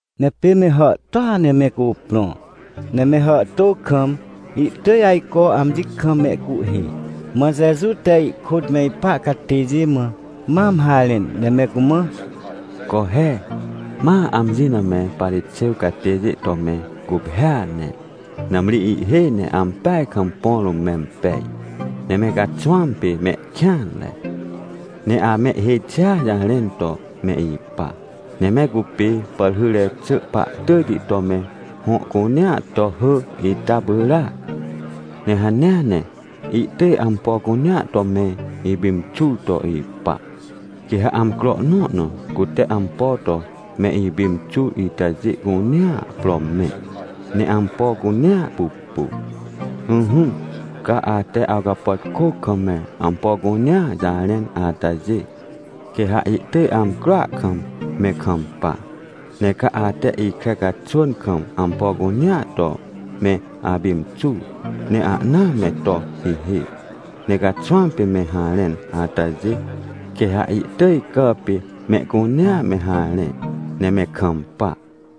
Ne pê me hàhtôa ne me cuprõ, ne me hàhtô kam, ihtỳj ajco amji kam mehcuhhê. Mã Jeju te ihkôt me ipa catêjê mã mam harẽn, ne me cumã: ― Co he, ma amji na me Parixêw catêjê to me guphêa ne, nãmri ihhêj ne ampeaj kam põ rũm mempej, ne me caxwãm pê mehkêanre. Ne amehhêj xia jarẽn to me ipa, ne me cupê pàrhyre xỳ pahtỳjti to me hõ cunea to hỳ ita pyràac. Ne hanea ne ihtỳj ampo cunea to me ipimxur to ipa. Quê ha amcro nõ na cute ampo to me ipimxur itajê cunea pro mẽ, ne ampo cunea pupu. Ỹhỹ, ca ate awcapàtkô kam me ampo cunea jarẽn atajê, quê ha ihtỳj amcroa kam me kampa. Ne ca ate ikre caxwỳn kam ampo cunea to me apimxur, ne ahna me to hihê ne caxwãm pê me harẽn atajê, quê ha ihtỳj cà pê mehcunea me harẽ, ne me kampa.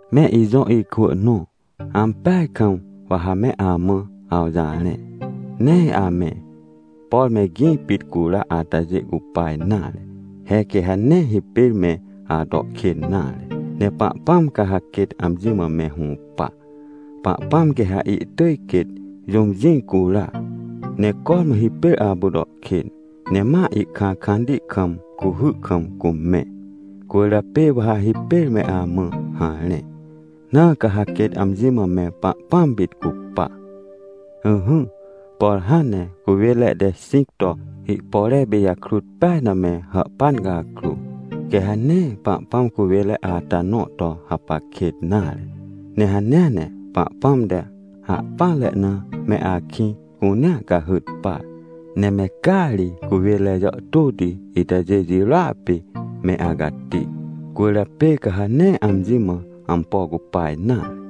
― Me ijõ ikwỳ nõ, ampeaj kam wa ha me amã awjarẽ, nee ame, por me gĩ pit cura atajê cupa nare. He quê ha nee hipêr me ato kên nare. Ne Pahpãm ca ha quêt amji mã me hũpa. Pahpãm quê ha ihtỳj quêt jũm jĩ cura, ne cormã hipêr apu to kên, ne ma ihkãkãnti kam cuhy kam cumẽ. Cwỳrjapê wa ha hipêr me amã harẽ, na ca ha quêt amji mã me Pahpãm pit cupa. ― Ỹhỹ, por hãn ne cuwênre te xĩc to ihpore pijakrut peaj na me hàhpan cakrô, quê ha nee Pahpãm cuwênre ata nõ to hapac kêt nare. Ne hanea ne Pahpãm te ahpỹanre na me akĩ cunea cahyt par. Ne me caa ri cuwênre jàhtôti itajê jirôa pê me acati. Cwỳrjapê ca ha nee amji mã ampo cupa nare.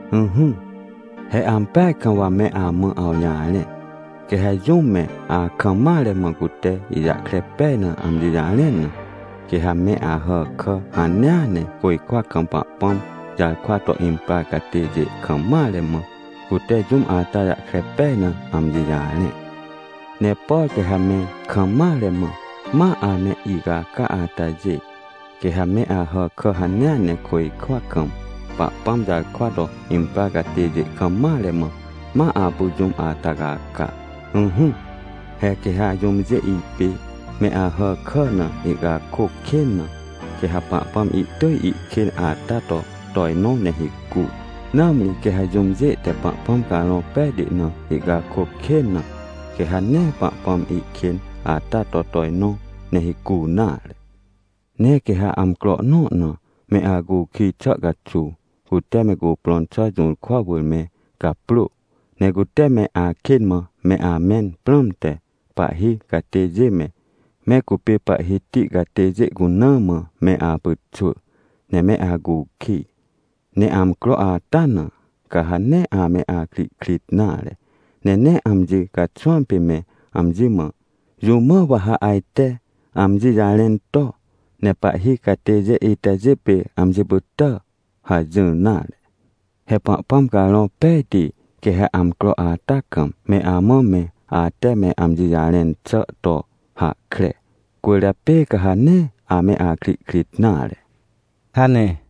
― Ỹhỹ, he ampeaj kam wa me amã awjarẽ, quê ha jũm me akam mare mã cute ijahkre pej na amji jarẽn na, quê ha me Ahàkà hanea ne côjkwa kam Pahpãm jarkwa to imprar catêjê kam mare mã, cute jũm ata jahkre pej na amji jarẽ. Ne por quê ha me kam mare mã, ma ame icaca atajê, quê ha me Ahàkà hanea ne côjkwa kam Pahpãm jarkwa to imprar catêjê kam mare mã, ma apu jũm ata caca. ― Ỹhỹ, he quê ha jũmjê ipê me Ahàkà na ihcakôc kên na, quê ha Pahpãm ihtỳj ihkên ata to tojnõ ne hicu. Nãmri quê ha jũmjê te Pahpãm Carõ Pejti na ihcakôc kên na, quê ha nee Pahpãm ihkên ata to tojnõ ne hicu nare. ― Ne quê ha amcro nõ na me acukij xà caxuw, cute me cuprõn xà jũrkwa wỳr me gaprô. Ne cute me akên mã me amẽn prãmte, pahhi catêjê me, me cupê pahhiti catêjê cuna mã me apyxwỳ, ne me acukij. Ne amcro ata na, ca ha nee ame akrihkrit nare, ne nee amji caxwãm pê me amji mã: “Jũ mã wa ha ajte amji jarẽn to, ne pahhi catêjê itajê pê amji pytà?” hajỹr nare. He Pahpãm Carõ Pejti quê ha amcro ata kam, me amã me ate me amji jarẽn xà to hahkre, cwỳrjapê ca ha nee ame akrihkrit nare ― hane.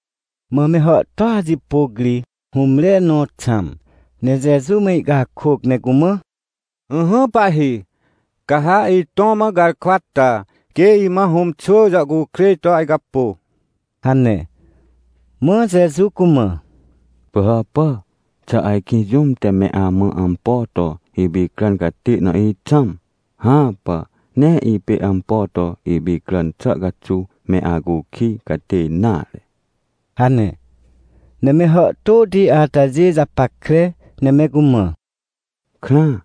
Mã me hàhtôa jipôc ri hũmre nõ xãm, ne Jeju mã ihcakôc ne cumã: ― Ỹhỹ, Pahhi! Ca ha itõ mã garkwa ta, quê imã hũm xwỳ jàhcukrêj to ajcapô ― hane. Mã Jeju cumã: ― Pỳhàpà, xà ajkĩ jũm te me amã ampo to ipicràn catê na ixãm? Hãpà. Nee ipê ampo to ipicràn xà caxuw me acukij catê nare ― hane. Ne me hàhtôti atajê japackre, ne me cumã: ― Krãa,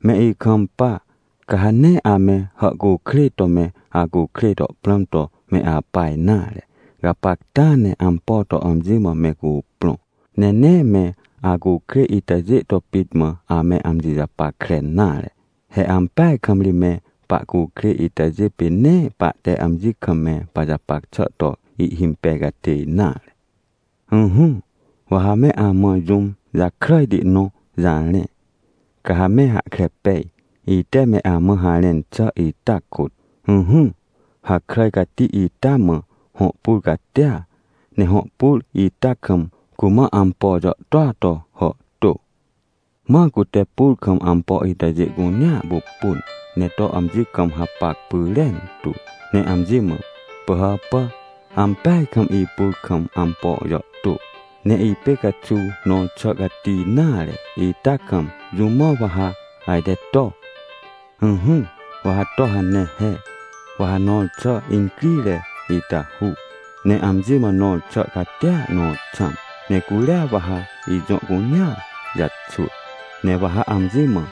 me ikampa! Ca ha nee ame hàhcukrêj to me acukrêj to prãm to me apa nare. Gapacta ne ampo to amji mã me cuprõ, ne nee me acukrêj itajê to pit mã ame amji japackre nare. He ampeaj kam ri me pahcukrêj itajê pê nee pahte amji kam me pajapac xà to ihhimpej catê nare. ― Ỹhỹ, wa ha me amã jũm jakràjti nõ jarẽ, ca ha me hahkre pej, ite me amã harẽn xà ita kôt. ― Ỹhỹ, hakràj cati ita mã hõ pur catia, ne hõ pur ita kam cumã ampo jàhtôa to hàhtô. Mã cute pur kam ampo itajê cunea pupun, ne to amji kam hapac pyrentu, ne amji mã: “Pỳhàpà, ampeaj kam ipur kam ampo jàhtô, ne ipê caxuw nõr xà cati nare ita kam, jũ mã wa ha ajte to? “Ỹhỹ, wa ha to hane he. Wa ha nõr xà incrire ita hu, ne amji mã nõr xà catia nõ xãm, ne curia wa ha ijõ cunea jaxwỳ. Ne wa ha amji mã,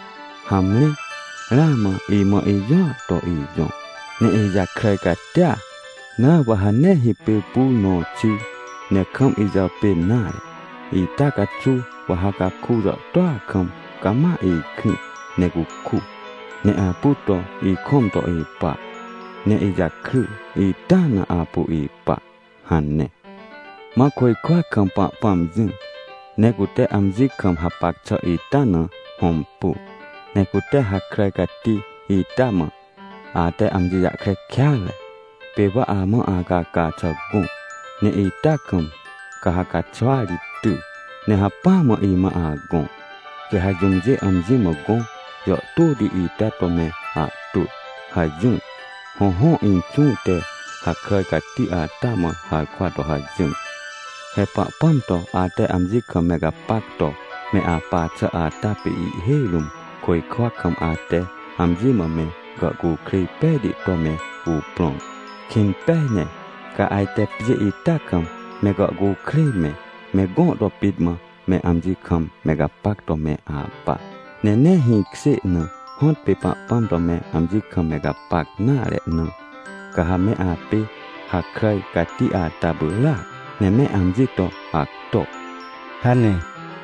‘Hamre, ramã imã ijõa to ijõ, ne ijakràj catia, na wa ha nee hipêr pur nõ xir, ne kam ijàpên nare. Ita caxuw wa ha caku jàhtôa kam cama ikrĩ ne cuku, ne apu to ikõm to ipa, ne ijakry ita na apu ipa’” hane. ― Mã côjkwa kam Pahpãm jỹ, ne cute amji kam hapac xà ita na hõmpu, ne cute hakràj cati ita mã: “Ate amji jahkre kêatre. Pê wa amã acaca xà gõ, ne ita kam ca ha caxwa ri ty, ne hacpỹa mã imã agõ. Quê ha jũmjê amji mã gõ jàhtôti ita to me ahtwỳ” hajỹr. Hõhõ, Inxũ te hakràj cati ata mã harkwa to hajỹr. ― He Pahpãm to ate amji kam me gapac to me apa xà ata pê ihhêj rũm côjkwa kam ate amji mã me gàhcukrêj pejti to me cuprõn. Kĩn pej ne, ca ajte pjê ita kam me gàhcukrêj me, me gõ to pit mã me amji kam me gapac to me apa, ne nee hĩkjê na, hõtpê Pahpãm to me amji kam me gapac nare na, ca ha me apê hakràj cati ata pyràac, ne me amji to acto ― hane.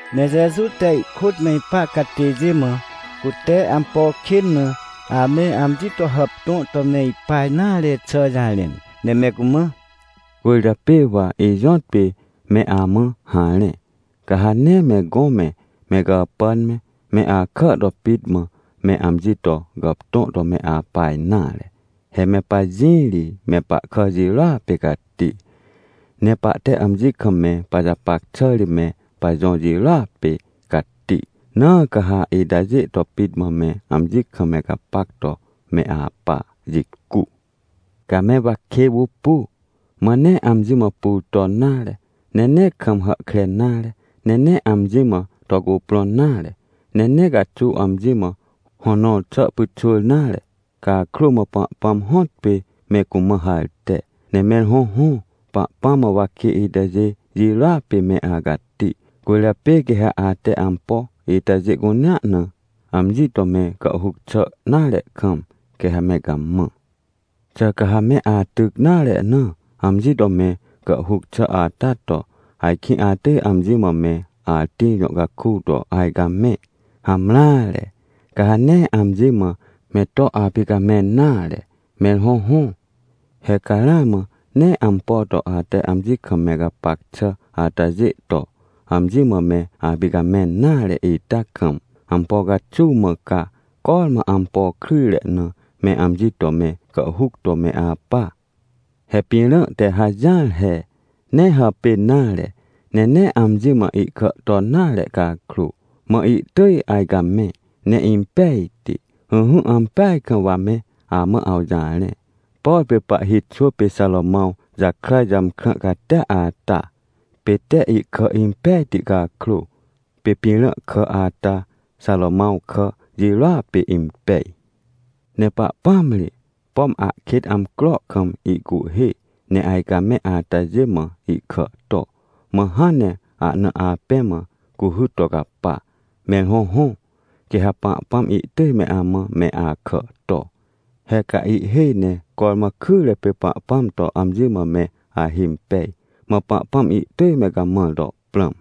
Ne Jeju te ihkôt me ipa catêjê mã, cute ampo kên na ame amji to hàptõ to me ipa nare xà jarẽn, ne me cumã: ― Cwỳrjapê wa ijõtpê me amã harẽ, ca ha nee me gõ me, me gàpàn me, me akà to pit mã me amji to gàptõ to me apa nare. He me pajĩ ri me pahkà jirôa pê cati, ne pahte amji kam me pajapac xà ri me pajõ jirôa pê cati, na ca ha itajê to pit mã me amji kam me gapac to me apa jicu. ― Ca me wakê pupu, mã nee amji mã pur ton nare, ne nee kam hàhkre nare, ne nee amji mã to cuprõn nare, ne nee caxuw amji mã hõ nõr xà pyxwỳr nare. Cakrô mã Pahpãm hõtpê me cumã harte. Ne mẽr hõhõ, Pahpãm mã wakê itajê jirôa pê me acati. Cwỳrjapê quê ha ate ampo itajê cunea na, amji to me gàhhuc xà nare kam, quê ha me gamã. Xà ca ha me atyc nare na, amji to me gàhhuc xà ata to, ajkĩ atỳj amji mã me atĩr jõ caku to ajcamẽ? Hamreare, ca ha nee amji mã me to apicamẽn nare. Mẽr hõhõ, he ca ramã nee ampo to ate amji kam me gapac xà atajê to, amji mã me apicamẽn nare ita kam, ampo caxuw mã ca cormã ampo kryjre na me amji to me gàhhuc to me apa? ― He pĩrã te hajỹar he. Nee hàpên nare, ne nee amji mã ihkà ton nare cakrô, mã ihtỳj ajcamẽ ne impejti. Ỹhỹ, ampeaj kam wa me amã awjarẽ, por pê pahhi xwỳ pê Xarômãw jakràj jàmkrã catia ata, pê te ihkà impejti cakrô, pê pĩrã kà ata Xarômãw kà jirôa pê impej. Ne Pahpãm ri, pom ahkêt amcro kam ihcuhhê ne ajcamẽ atajê mã ihkà to. Mã hãn ne ahna apẽ mã cuhy to capa. Mẽr hõhõ, quê ha Pahpãm ihtỳj me amã me akà to. He ca ihhêj ne cormã kyre pê Pahpãm to amji mã me ahimpej, mã Pahpãm ihtỳj me gamãr to prãm.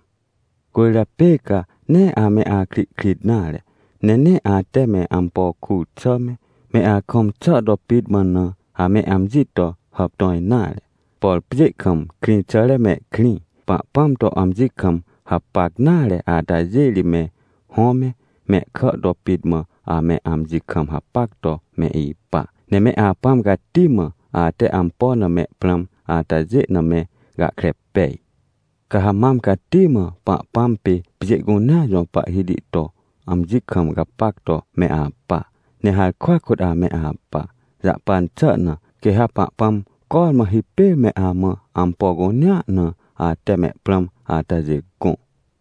― Cwỳrjapê ca nee ame akrihkrit nare, ne nee ate me ampo kur xà me, me akõm xà to pit mã na, ame amji to hàptõ nare. Por pjê kam krĩxàre mehkrĩ, Pahpãm to amji kam me hapac nare atajê ri me hõ me, mehkà to pit mã ame amji kam hapac to me ipa. Ne me Apãm Cati mã, ate ampo na me prãm atajê na me gahkre pej. Ca ha mam cati mã Pahpãm pê pjê cunea jõ Pahhiti to amji kam me gapac to me apa, ne harkwa kôt ame apa, jahpan xà na, quê ha Pahpãm cormã hipêr me amã ampo cunea na, ate me ahna prãm atajê gõ.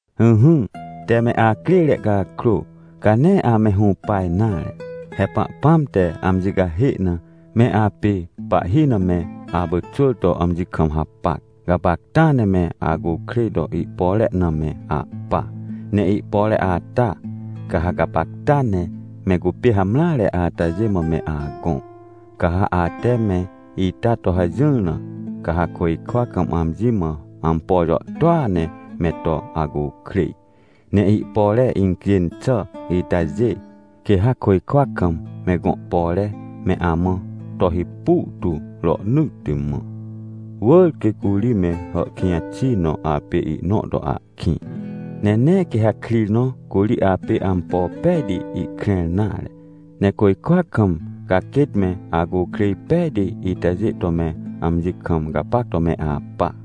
― Ỹhỹ, tee me acrêre cakrô, ca nee ame hũpa nare. He Pahpãm te amji cahê na, me apê pahhi na me apyxwỳr to amji kam hapac. Gapacta ne me acukrêj to ihpore na me ahpa, ne ihpore ata, ca ha gapacta ne me cupê hamreare atajê mã me agõ. Ca ha ate me ita to hajỹr na, ca ha côjkwa kam amji mã ampo jàhtôa ne me to acukrêj. Ne ihpore incjên xà itajê, quê ha côjkwa kam me gõ pore me amã to hipu tu rohnỳtti mã. Wỳr quê curi me hàhkĩj xi nõ apê ihnõ to ahkĩ, ne nee quê ha krir nõ curi apê ampo pejti ihkrẽr nare. Ne côjkwa kam ca quêt me acukrêj pejti itajê to me amji kam gapac to me apa.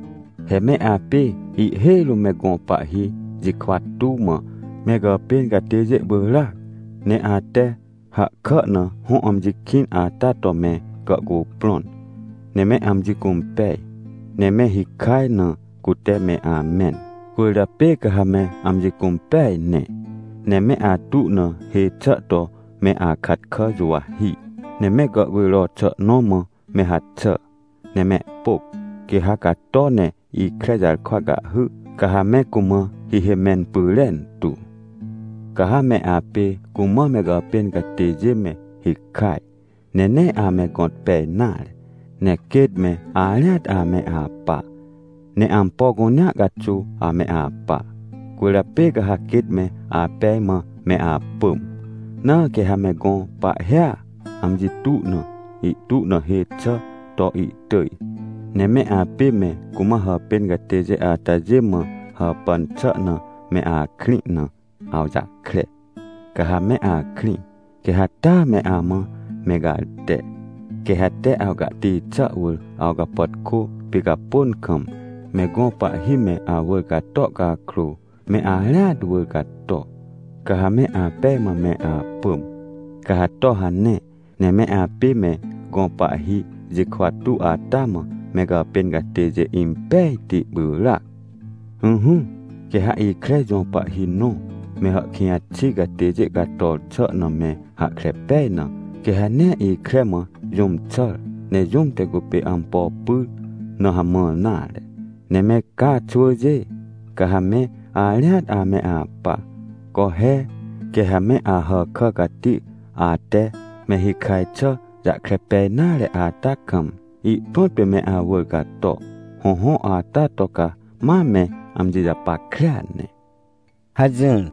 ― He me apê ihhêj rũm me gõ pahhi jikwa tuw mã me gàpên catêjê pyràac. Ne ate hahkà na hõ amji kĩn ata to me gàhcuprõn, ne me amji cũmpej, ne me hikaj na cute me amẽn. Cwỳrjapê ca ha me amji cũmpeaj ne. Ne me atu na hê xà to me akat kà juwahi, ne me gàhcujro xà nõ mã me haxà, ne mehpôc. Quê ha cato ne ikre jarkwa cahhy, ca ha me cumã hihê mẽn pyrentu. Ca ha me apê cumã me gàpên catêjê me hikaj, ne nee ame gõt pej nare, ne quêt me arĩat ame apa, ne ampo cunea caxuw ame apa, cwỳrjapê ca ha quêt me apej mã me apỳm. Na quê ha me gõ pahhia, amji tu na, ihtu na hê xà to ihtỳj, ne me apê me cumã hàpên catêjê atajê mã hàpàn xà na me akrĩ na awjahkre, ca ha me akrĩ, quê ha taa me amã me garte. Quê ha tee awcahti xà wỳr awcapàtkô picapôn kam, me gõ pahhi me awỳr cator cakrô, me arĩat wỳr cato, ca ha me apej mã me apỳm. Ca ha to hane, ne me apê me gõ pahhi jikwa tuw ata mã me gàpên catêjê impejti pyràac. ― Ỹhỹ, quê ha ikre jõ pahhi nõ, me hàhkĩj xi catêjê cator xà na me hahkre pej na, quê ha nee ikre mã jũm xàr, ne jũm te cupê ampo pyr na hamãr nare. Ne me ca xwỳjê, ca ha me arĩat ame apa. Co he, quê ha me Ahàkà cati ate me hikaj xà jahkre pej nare ata kam, ihprõt pê me awỳr cato. Hõhõ, ata to ca ma me amji japackrea ne ― hajỹr.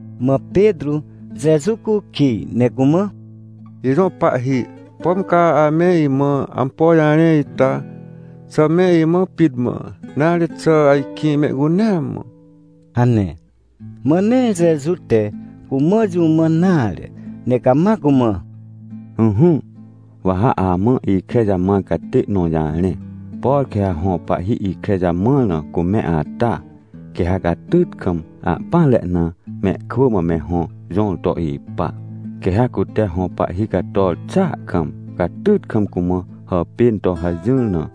Mã Petrô Jeju cukij, ne cumã: ― Ijõ pahhi, pom ca ame imã ampo jarẽ ita, xà me imã pit mã, nare, xà ajkĩ mehcunea mã? ― hane. Mã nee Jeju te cumã jũ mãn nare, ne cama cumã: ― Ỹhỹ, wa ha amã ikre jamãr catê nõ jarẽ. Por quê ha hõ pahhi ikre jamãr na cumẽ ata, quê ha catyt kam, ahpỹanre na mehkwỳ mã me hõ jõr to ipa. Quê ha cute hõ pahhi cator xàa kam, catyt kam cumã hàpên to hajỹr na,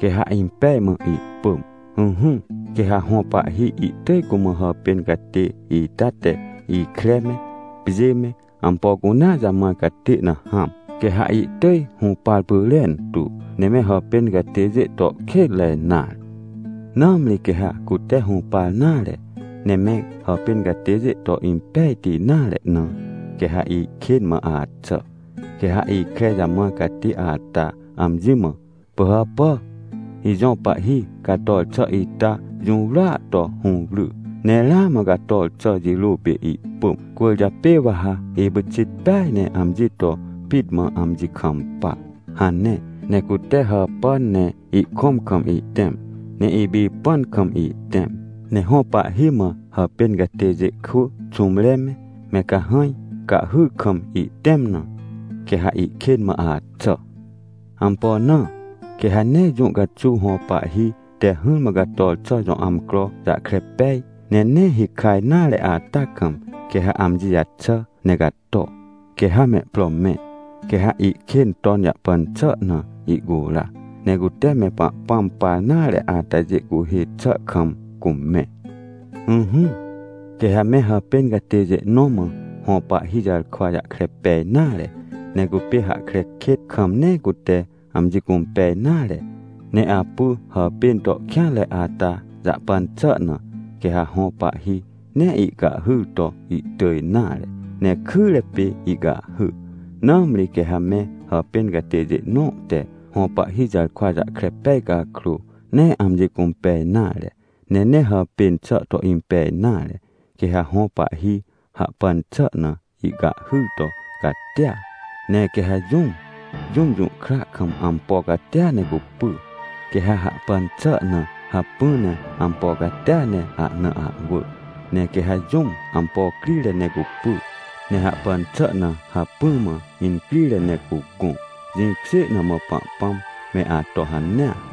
quê ha impej mã ihpỳm. Ỹhỹ, quê ha hõ pahhi ihtỳj cumã hàpên catê ita te ikre me, pjê me, ampo cunea jamãr catê na hãm. Quê ha ihtỳj hũpar pyrentu, ne me hàpên catêjê to kênre nare. ― Nãmri quê ha cute hũpar nare, ne me hàpên catêjê to impejti nare na, quê ha ihkên mã axà. Quê ha ikre jamãr catê ata amji mã: “Pỳhàpà, ijõ pahhi cator xà ita jũwrya to hũwry, ne ramã cator xà jirô pê ihpỳm, cwỳrjapê wa ha ipyxit peaj ne amji to pit mã amji kampa” hane. Ne cute hàpàn ne ihkõm kam ihtẽm, ne ipipãn kam ihtẽm, ne hõ pahhi mã hàpên catêjê kwỳ xũmre me, me cahãj cahhyr kam ihtẽm na, quê ha ihkên mã axà. Ampo na? Quê ha nee jũ caxuw hõ pahhi te hỹrmã cator xà jõ amcro jahkre pej, ne nee hikaj nare ata kam, quê ha amji jaxà ne cato, quê ha mehpro mẽ. Quê ha ihkên ton jahpan xà na ihcura, ne cute me Pahpãm par nare atajê cuhhê xà kam cumẽ. ― Ỹhỹ, quê ha me hàpên catêjê nõ mã hõ pahhi jarkwa jahkre pej nare, ne cupê hahkre kêt kam nee cute amji cũmpej nare, ne apu hàpên to kêanre ata jahpan xà na, quê ha hõ pahhi nee ihcahhyr to ihtỳj nare, ne kyre pê ihcahhy. Nãmri quê ha me hàpên catêjê nõ te hõ pahhi jarkwa jahkre pej cakrô, nee amji cũmpej nare, ne nee hàpên xà to impej nare, quê ha hõ pahhi hahpan xà na, ihcahhyr to catia. Ne quê ha jũm, jũm jũhkra kam, ampo catia ne cupy, quê ha hahpan xà na hacpỹ ne ampo catia ne ahna ahwỳ. Ne quê ha jũm ampo crire ne cupy ne hahpan xà na hacpỹ mã incrire ne cugõ. Jĩkjê na mã Pahpãm me ato hanea.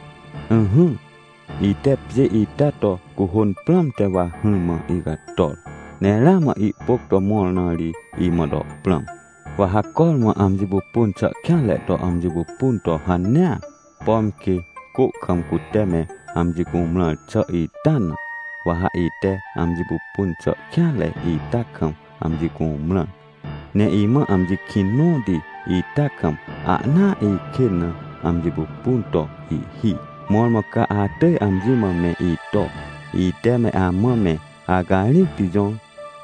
― Ỹhỹ, ite pjê ita to cuhôn prãmte wa hỹrmã icator. Ne ramã ihpôc to mõr na ri imã to prãm. Wa ha cormã amji pupun xà kêanre to amji pupun to hanea, pom quê, cô kam cute me amji cumrãr xà ita na, wa ha ite amji pupun xà kêanre ita kam amji cumrã. Ne imã amji kĩn nõti ita kam ahnaa ikên na amji pupun to ihhi. ― Mõrmõ ca atỳj amji mã me ito, ite me amã me acarĩcti jõr,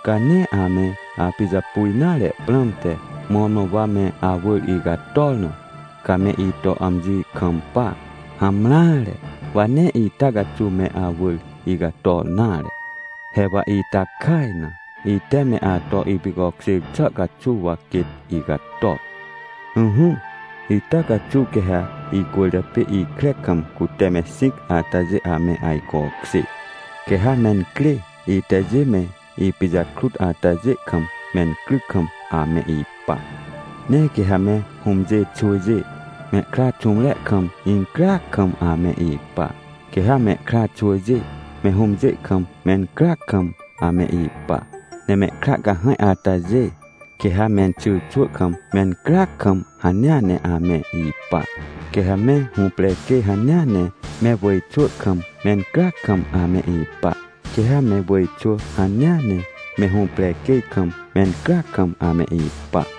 ca nee ame apijapu nare prãmte, mõrmõ wa me awỳr icator na, ca me ito amji kampa. Hamreare, wa nee ita caxuw me awỳr icator nare. He wa ita kaj na, ite me ato ipicokjêr xà caxuw wa quêt icator. Ỹhỹ, ita caxuw quê ha icwỳrjapê ikre kam cute me xĩc atajê ame ajcokjê, quê ha mencrê itajê me ipijakrut atajê kam mencryc kam ame ipa. Ne quê ha me hũmjê xwỳjê mehkra xũmre kam incryac kam ame ipa. Quê ha mehkra xwỳjê me hũmjê kam mencryac kam ame ipa, ne mehkra cahãj atajê, quê ha menxyrxwỳ kam mencryac kam hanea ne ame ipa. Quê ha me hũprequêj hanea ne me wỳjxwỳ kam mencryac kam ame ipa. Quê ha me wỳjxwỳ hanea ne me hũprequêj kam mencryac kam ame ipa.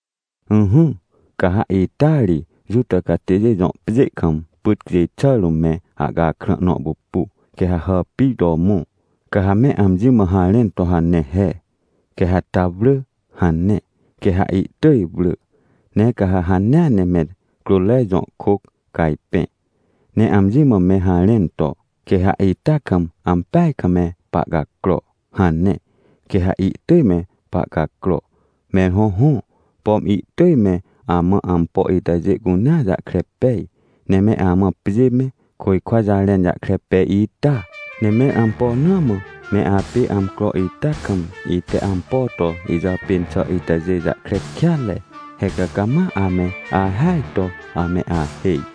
― Ỹhỹ, ca ha ita ri Juta catêjê jõ pjê kam pyt cjêj xà rũm me ahcakrã nõ pupu, quê ha hàpir to mõ, ca ha me amji mã harẽn to hane he: “Quê ha ta wrỳ” hane. Quê ha ihtỳj wrỳ. Ne ca ha hanea ne me crôtre jõ kôc cajpẽ, ne amji mã me harẽn to: “Quê ha ita kam ampeaj kam me pahcacro” hane. Quê ha ihtỳj me pahcacro. Mẽr hõhõ, pom ihtỳj me amã ampo itajê cunea jahkre pej, ne me amã pjê me, côjkwa jarẽn jahkre pej ita. Ne mẽr ampo na mã me apê amcro ita kam, ite ampo to ijàpên xà itajê jahkre kêatre? He ca cama ame ahêaj to ame ahêj!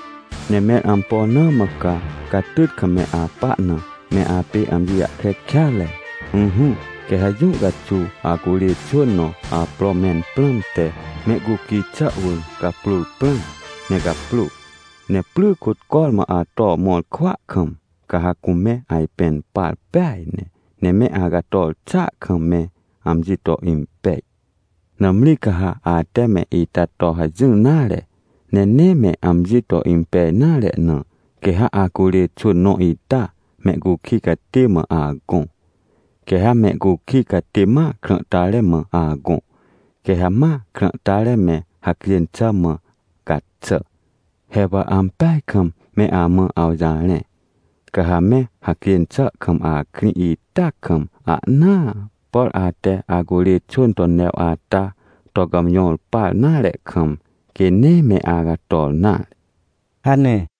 ― Ne mẽr ampo na mã ca catyt kam me apa na me apê amji jahkre kêatre? Ỹhỹ, quê ha jũ caxuw acurê xwỳn nõ apro mẽn prãmte mehcukij xà wỳr gaprôr prãm, ne gaprô. Ne pry kôt cormã ato mõr kwỳa kam, ca ha cume ajpẽn par peaj ne, ne me acator xàa kam me amji to impej. Nãmri ca ha ate me ita to hajỹr nare, ne nee me amji to impej nare na, quê ha acurê xwỳn nõ ita, mehcukij catê mã agõ, quê ha mehcukij catê ma krãhtare mã agõ, quê ha ma krãhtare me hacjên xà mã gaxà. He wa ampeaj kam me amã awjarẽ, ca ha me hacjên xà kam akrĩ ita kam ahnaa, por ate acurê xwỳn to new ata to gàmjõr par nare kam, quê nee me acator nare ― hane.